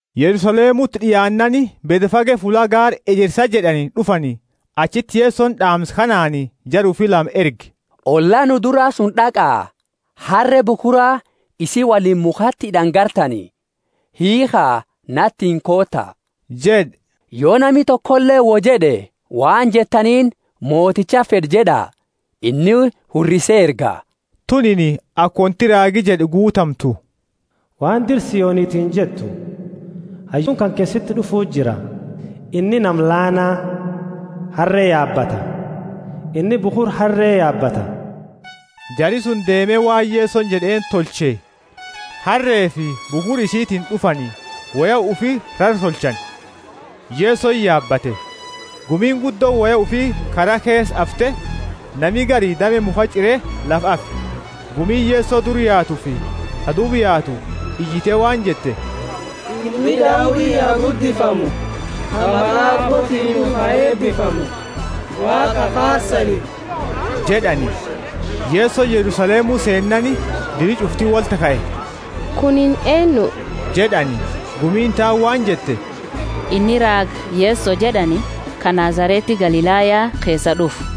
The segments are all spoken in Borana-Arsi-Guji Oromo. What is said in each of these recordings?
Yerusalemuti d'iaannaani, Bethfage fulla Gaara Ejersa jed'ani d'ufani. Achiti Yesoni d'aamsa kanaani jara ufi lama erge: Olla nu dura suni d'aqa, harre bukhura isii woliini mukhati hid'ani gartani. Hiikha, natiini koota jed'e. Yo nami tokoleeni woi jed'e, waan jettaniini, Motichati fed'a jed'a, inni hurrise erga. Tunini aka wonti raagi jed'e guutamtu: Waan dira Sionitini jettu: Hayyuuni kanke siti d'ufu jira, inni nama laana, harre yaabata, inni bukhura harre yaabata. Jari suni deeme waan Yesoni jed'eeni tolche, harrefi bukhura isitiini d'ufani, woya ufi rara tolchani, Yesoni yaabate. Gumiini guddooni woya ufi kara keesa afte, nami gari dame mukhaa ch'ire lafa afe. Gumiini Yeso dura yaatufi ta duuba yaatu iyite waan jette, Ilmi Daudi ha guddifamu. Ka maqa Aabbootiini d'ufu ha eebifamu! Waaqa ha faarsani jed'ani! Yesoni Yerusalemu seennaani diri ch'ufti wolti kae. Kuni eennu? jed'ani. Gumiini taani waan jette, Inni raaga Yeso jed'ani, ka Nazareti Galilaya keesaa d'ufu.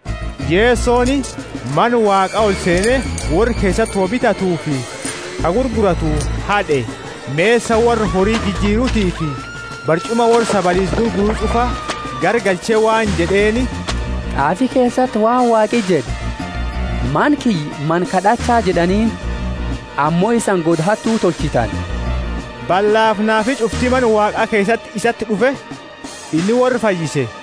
Yesoni Mana Waaqa olseene, worra keesati woi bitatufi ka gurguratu had'e, mesa worra hori jijirutiifi barch'uma worra sabaliisa gurguru ch'ufa garagalche waan jed'eeni, T'aafi keesati waan Waaqi jed'e, Mana kiyya mana kad'acha jed'aniini, ammo isani goda hattu tolchitani. Ballafi naafi ch'ufti Mana Waaqa keesati isati d'ufe, inni worra fayyise.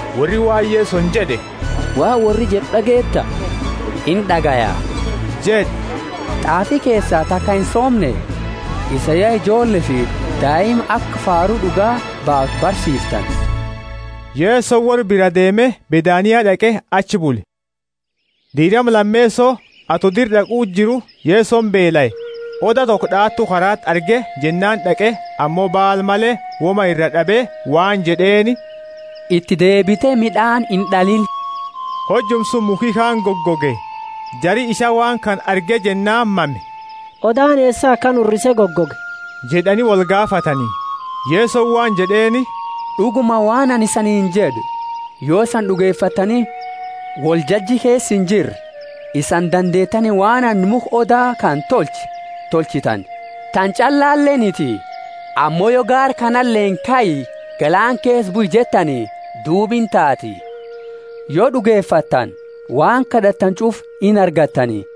Worri waan Yesoni jed'e, Waan worri jed'u d'ageeta? Ind'agaya jed'e. T'aafi keesa taka insoomne? Isani ya ijoolleefi daima aka faaru d'uga baaftu barsiiftani. Yesoni worra biraa deeme, Bethania d'aqe achi bule. Diirama lameeso, ato dira d'aqu jiru, Yesoni beelae. Oda toko d'aatu karaati arge, jennaani d'aqe ammo baala male woma iraa d'abe waan jed'eeni, Iti deebite mid'aani ind'aliini. Hojuma suni mukhi kaani gogoge. Jari isaa waan kana arge jennaani mame, Odaani eesa akana hurrise gogoge? jed'ani wolgaafatani. Kor 13.2Yesoni waan jed'eeni, D'uguma, waan anini isaniini jed'u, Yo isani d'ugefattani, woljaji keesa injirre, isani dandeetani waan anini mukha oda kana tolche tolchitani. Tana ch'allaleniti, ammo yo gaara kanaleeni, Kai, galaana keesa bui jettani, duuba intaati. Yo d'ugefattani waan kad'attani ch'ufa inargattani.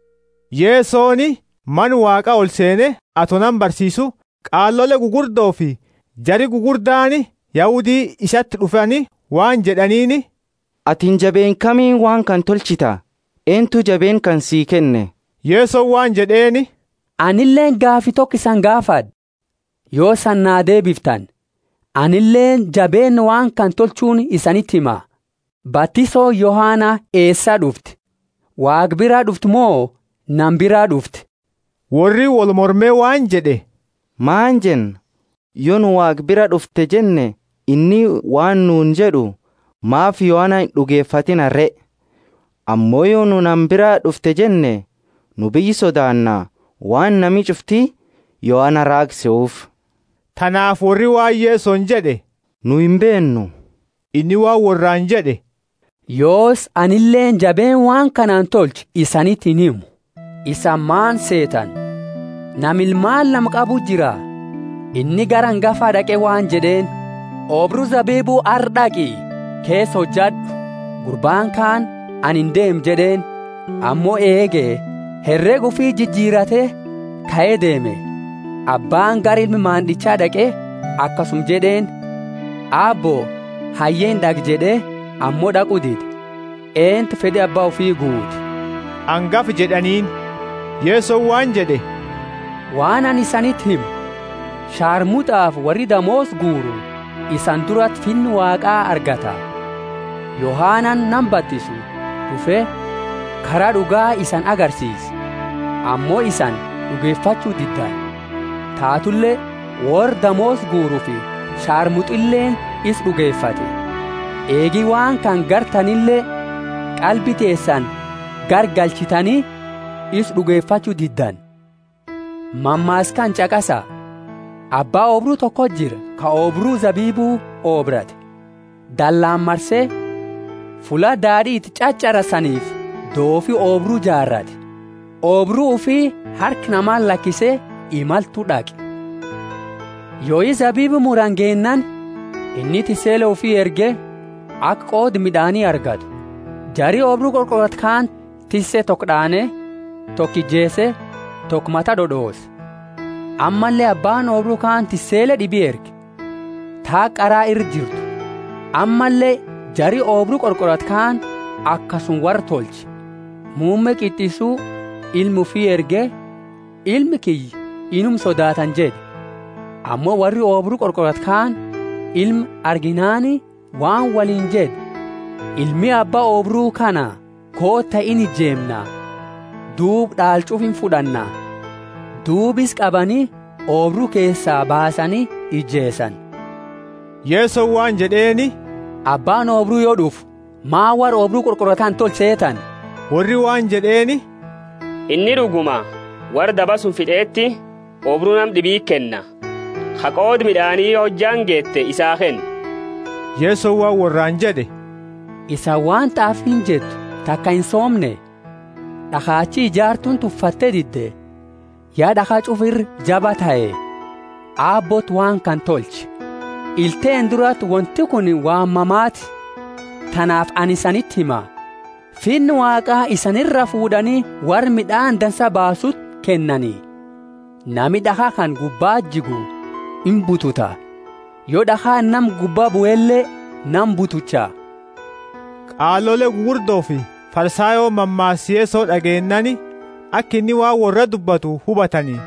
Yesoni Mana Waaqa olseene; ato nama barsiisu, qaalole gugurdofi jari gugurdaani Yahudi isati d'ufani waan jed'aniini, Atini jabeenna kamiini waan kana tolchita? Eentu jabeenna kana sii kenne? Yesoni waan jed'eeni, Anileeni gaafi toko isani gaafad'a; yo isani naa deebiftani, anileeni jabeenna waan kana tolchuuni isaniti hima. Batisooni Yohana eesaa d'ufte? Waaqa biraa d'ufte mo nama biraa d'ufte? Worri wolmorme waan jed'e, Maani jenna? Yo nu Waaqa biraa d'ufte jenne, inni waan nuuni jed'u, Maafi Yohana ind'ugefatiina re? Ammo yo nu nama biraa d'ufte jenne, nu biyya sodaanna, waan nami ch'ufti Yohana raaga sehuufi. Tanaafi worri waan Yesoni jed'e, Nu imbeennu. Inni waan worraani jed'e, Yoosi, anileeni jabeenna waan kanaani tolchu isaniti inhimu. Isani maani seetani? Nama ilmaani lama qabuti jira. Inni gara angafa d'aqe waan jed'eeni, Oobru zabibu arra d'aqi keesa hojad'u. Gurbaani kaani, Ani indeemu jed'eeni; ammo eege herega ufi jijirate kae deeme. Abbaani gara ilma mand'icha d'aqe akasuma jed'eeni. Aabbo, hayye ind'aqa jed'e, ammo d'aqu dide. Eentu fed'i abba ufi guute? Angafa jed'aniini. Yesoni waan jed'e, Waan anini isaniti himu, sharmut'afi worri damoosa guuru isani durati Finna Waaqa argata. Yohanani nama batisu d'ufe kara d'uga isani agarsiise, ammo isani d'ugefachu diddani; tatule worra damoosa guurufi sharmut'ileeni isa d'ugefatte. Eegi waan kana gartanile, qalbi teesani garagalchitani isa d'ugefachu diddani. Mammaasa kana ch'aqasa. Abba oobru toko jira ka oobru zabibu oobrate, dallaani marse, fulla daad'i iti ch'ach'arasanifi doofi oobru jaarate. Oobru ufi harka namati lakise, imaltu d'aqe. Yoi zabibu murani geennaani, inni tissele ufi erge, aka qooda mid'aani argatu. Jari oobru qorqoratu kaani tisse toko d'aane, toko ijeese, toko mata d'od'oose. Ammalle abbaani oobru kaani tissele d'ibi erge, ta haga qara ira jirtu, ammalle jari oobru qorqoratu kaani akasuma worra tolche. Muumme qit'issu, ilma ufi erge, Ilma kiyya inuma sodaatani jed'e. Ammo worri oobru qorqoratu kaani ilma arginaani waan woliini jed'e, Ilmi abba oobru kana, koota inijeemna; duuba d'aala ch'ufa imfud'anna. Duuba isa qabani, oobru keesaa baasani ijeesani. Yesoni waan jed'eeni, Abbaani oobru, yo d'ufu, maani worra oobru qorqoratu kana tolcha seetani? Worri waan jed'eeni, Inni d'uguma worra daba suni fit'eti, oobru nama d'ibiti kenna, ka qooda mid'aani yo hojjaani geete, isaa kennu. Yesoni waan worraani jed'e, Isani waan t'aafiini jettu taka insoomne? D'akhachi ijaartuuni tuffatte dide ya d'akha ch'ufa ira jabaa tahe. Aabbooti waan kana tolche, ila teenna durati wonti kuni waan mamaati! Tanaafi anini isaniti hima, Finna Waaqa isani iraa fuud'ani worra mid'aani dansa baasuuti kennani. [ Nami d'akha kana gubbati jigu imbututa; yo d'akhaani nama gubba buele nama butucha.] Qaalole gugurdofi Farisayooni mammaasa Yeso d'ageennaani, aka inni waan worra dubbatu hubatani;